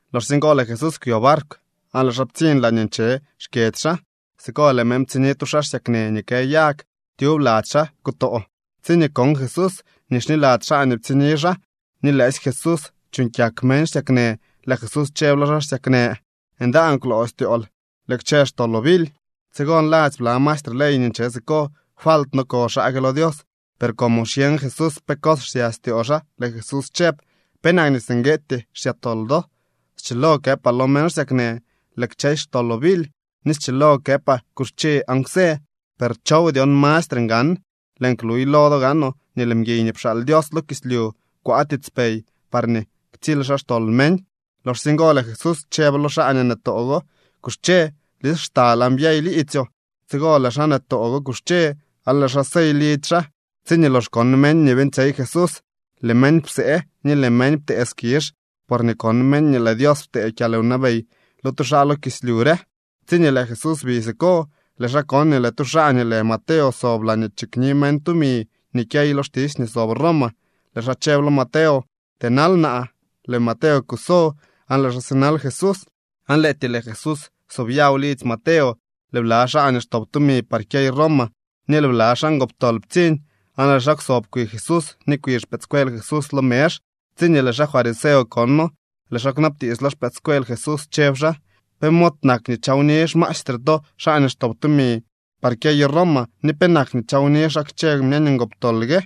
Loxsye ngo lëë Jesús kwyo barkw aan lëë xaa ptsiñ laañee nche xkyedzy xaa. Siko lëë meñ ptsiñni tu xaa xsyaknë nii kë yag. Tyub lady xaa kutoo. Tsiñee kon Jesús nii xniladzy xaa nii ptsiñni xaa nii lëësy Jesús chuuñ kyak meñ xsyaknë, lëë Jesús chëb lo xaa xsyaknë: —Ndaan kwloo styool. Lëë kchë xtoloo bily. Tsigo nladzy bla maestre ley nii nche siko: “Falt no ko xaa gue lo Dios.” Per como xyeñ Jesús pe cos xsya styoo xaa, lëë Jesús chëb: —¿Penak nii singueetyee xsya tol do? Schilo këpaa lo meñ xsyaknë: “Lëë kchësy xtoloo bily”, ni schilo këpaa: “Kuxche aan kwsë”, per ¿chow dyon mastre ngan? Lëën kluy lo do gaanoo nii lëë mguiy nii pxaal Dios lo kislyu kwaa tiitspey parñee ktsily xaa xtol meñ. Loxsye ngo lëë Jesús chëb lo xaa nii nëtoo go: —Kuxche, blis xtal aan byey liidzyoo. Tsigo lëë xaa nëtoo go kuxche aan lëë xaa sey lidzy xaa. Tsiñee lox kon meñ nii beeñtsyey Jesús, lëë meñ psee, ni lëë meñ ptee skizh porñee kon meñ nii lëë Dios ptee kyalwnabey lo tu xaa lo kislyu re. Tsiñee lëë Jesús bi siko, lëë xaa kon nii lëë tu xaa nii lë Mateo sob laañee chikni meñ tumi nii kyey lo xtisy nii sob Roma. Lëë xaa chëb lo Mateo: —Tënal naa. Lëë Mateo kuso aan lëë xaa sinal Jesús. Aan lëëtyee lëë Jesús sobyaw lidzy Mateo, lëë bla xaa nii xtop tumi par kyeyo Roma ni lëë bla xaa ngoptol ptsiñ, aan lëë xaa kwsob kwi Jesús ni kwi xpëëdscuel Jesús lo mezh. Tsiñee lëë xaa fariseo kono, lëë xaa kwnabtiits lo xpëëdscuel Jesús, chëb xaa: —¿Pe mod nak nii chawni xmaestre to xaa nii xtop tumi par kyeyo Roma ni penak nii chawni xaa kchë meñ ngoptol gue?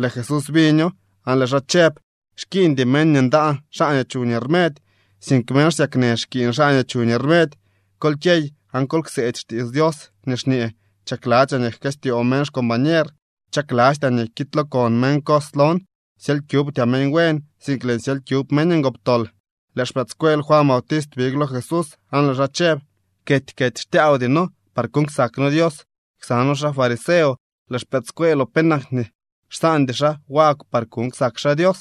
Lëë Jesús biño aan lëë xaa chëb: —Xkiiñdy meñ nii ndaan xaa nii chuñ rmedy, sink meñ xsyaknë xkiiñ xaa nii chuñ rmedy. Kol kyey aan kol kseedy xtiits Dios nii xñee: “Chakladzyaa nii jkëstyoo meñ xcombañer, chaklastyaa nii kiidlookon meñ cos lon.” Syely kyubtyaa meñ buen, sink lëën syely kyub meñ ngoptol. Lëë xpëëdscuel Juan Bautist big lo Jesús, aan lëë xaa chëb: —Kety kety xtyaawdy noo par kuuñ ksak noo Dios ksa noo xaa fariseo. Lëë xpëëdscueeloo, ¿penak nii xsaandy xaa wagw par kuuñ ksak xaa Dios?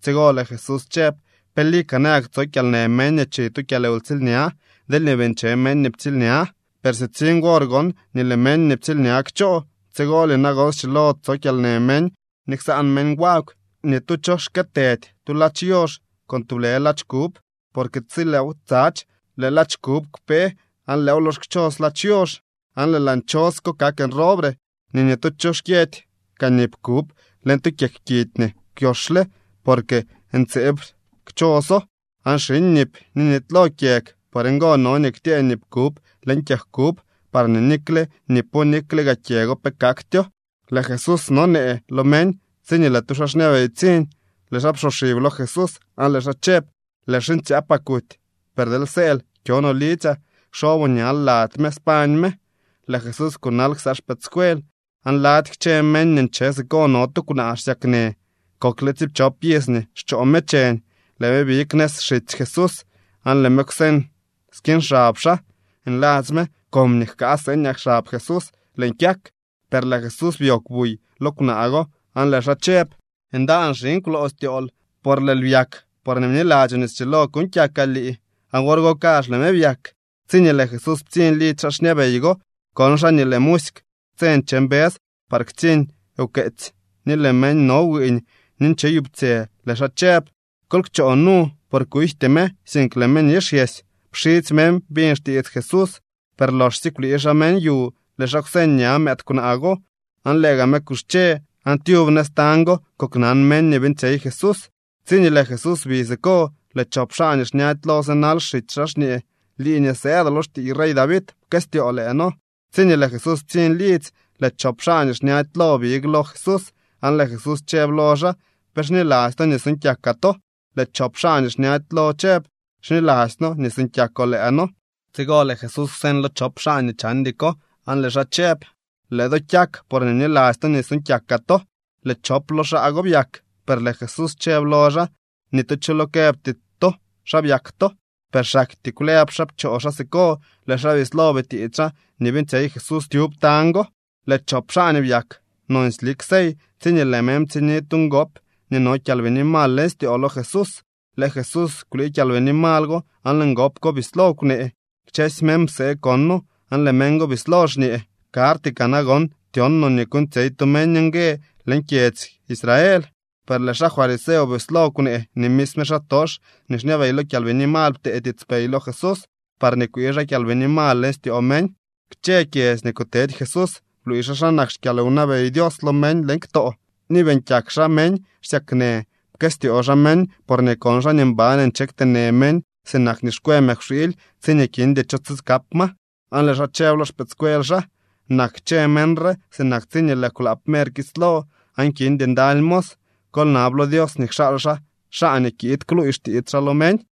Tsigo lëë Jesús chëb: —¿Pe lika nayak tso kyalnë meñ nii chi tu kyalwtsiilña deelñee bii nche meñ nii ptsiilña? Per sitsiñ wor gon nii lëë meñ nii ptsiilña kchoo, tsigolye nagon schilo tso kyalnë meñ ni ksaan meñ wagw. ’Ni tu cho xkëëtëdy tu ladx yoox con tublë ladx kub, porque tsi lëëw tsadx, lëë ladx kub kpe aan lëëw lox kchos ladx yoox, aan lëë laa nchos ko kak nroobre. Ni ni tu cho xkyëdy kaa nip kub leñ tu kyeg kidy nii kwyoxle, porque ntseeb kchoso, aan xiñ nip ni nitylo kyeg. Por ngo no nii ktyëë nip kub leñ kyeg kub, parñee nikle nipo nikle gaa kyego pe kaktyoo. Lëë Jesús nonee lo meñ, tsiñee lëë tu xaa xñabey ptsiñ. Lëë xaa psoxib lo Jesús aan lëë xaa chëb: —Lëë xiñtsyaapaa kuty, per deel sëël kyo no lidzyaa kxoboo ñal lady me, spañ me. Lëë Jesús kunal ksa xpëëdscuel. Aan lady kchë meñ nii nche siko no tu kwnaa xsyaknë. Kokle tsiipchop iz nii xchoo me cheñ. Lëë me big nëz xitsy Jesús aan lëë me kwseñ skiñ xab xaa. Nladzy me: “Comñee jkaa seeñaa xab Jesús lëën kyak.” Per lëë Jesús byoogw buy lo kwnaa go aan lëë xaa chëb: —Ndaan, xiñ, kwloo styool. Por lëël byak porñee bniladzyoo nii schilo kuuñ kyakaa lii. Aan wor go kazh lëë me byak. Tsiñee lëë Jesús ptsiñ lidzy xaa xñabey go, kon xaa nii lëë musyk tse nche mbës par ktsiñ wkeetsy, ni lëë meñ no wiiñ ni ncheyuptsyë. Lëë xaa chëb: —Kol kchoo nu. Por kujty me, sink lëë me nixyesy. Pxidzy meñ biñ xtiits Jesús, per loxsye kwlii xaa meñ yu, lëë xaa kwseñ ña mëëd kwnaa go, aan lëë gaa me kuxche. Aan tyub nëz tañ go koknan meñ nii beeñtsyey Jesús. Tsiñee lëë Jesús bi siko, lëë chop xaa nii xñady lo sinal xitsy xaa, xñee: —¡Lii nii sëëdoo lo xtiiy rey David, pkëstyoo lëë noo! Tsiñee lëë Jesús ptsiñ lidzy, lëë chop xaa nii xñady lo big lo Jesús aan lëë Jesús chëb lo xaa: —¿Pe xniladzy to nii suuñ kyakaa to? Lëë chop xaa nii xñady lo chëb: —Xniladzy noo nii suuñ kyakoo lëë noo. Tsigo lëë Jesús kwseñ lo chop xaa nii chandy ko aan lëë xaa chëb: —Lëë do kyak porñee bniladzy to nii suuñ kyakaa to. Lëë chop lo xaa go byak. Per lëë Jesús chëb lo xaa: —Ni tu cho lo këbty to xa byak to. Per xaktyee kwlëb xaa pchoo xaa siko. Lëë xaa bislo bitiits xaa nii beeñtsyey Jesús tyub tañ go. Lëë chop xaa nii byak nonsy lik sey, tsiñee lëë meñ ptsiñni tu ngop nii no kyalbini mal leñ styoo lo Jesús. Lëë Jesús kwlii kyalbini mal go, aan lëë ngop ko bislo kwnee. Kchësy meñ psee kono aan lëë meñ bislo xñee: —Karty kaa nagon tyon no nii kuuñtsyey tu meñ ngue leñ kyedzy Israel. Per lëë xaa fariseo bislo kwnee nii misme xaatox nii xñabey lo kyalbini mal ptee tiitspey lo Jesús parñee kwii xaa kyalbini mal leñ styoo meñ. Kchë kyedzy nii kutedy Jesús bluuy xaa xa nak xkyalwnabey Dios lo meñ leñ ktoo, ni beeñ kyak xaa meñ xsyaknë. Pkëstyoo xaa meñ porñee kon xaa nii mban nche kteenë meñ sinak nii xkwë mëkwxiily tsiñee kindy cho tsikap ma. Aan lëë xaa chëb lo xpëëdscuel xaa: —Nak kchë meñ re sinak tsiñee lëë kwlaap mer kislo aan kindy ndaly mos. Kol nab lo Dios nii kxaal xaa xaa nii kiid kluuy xtiits xaa lo meñ.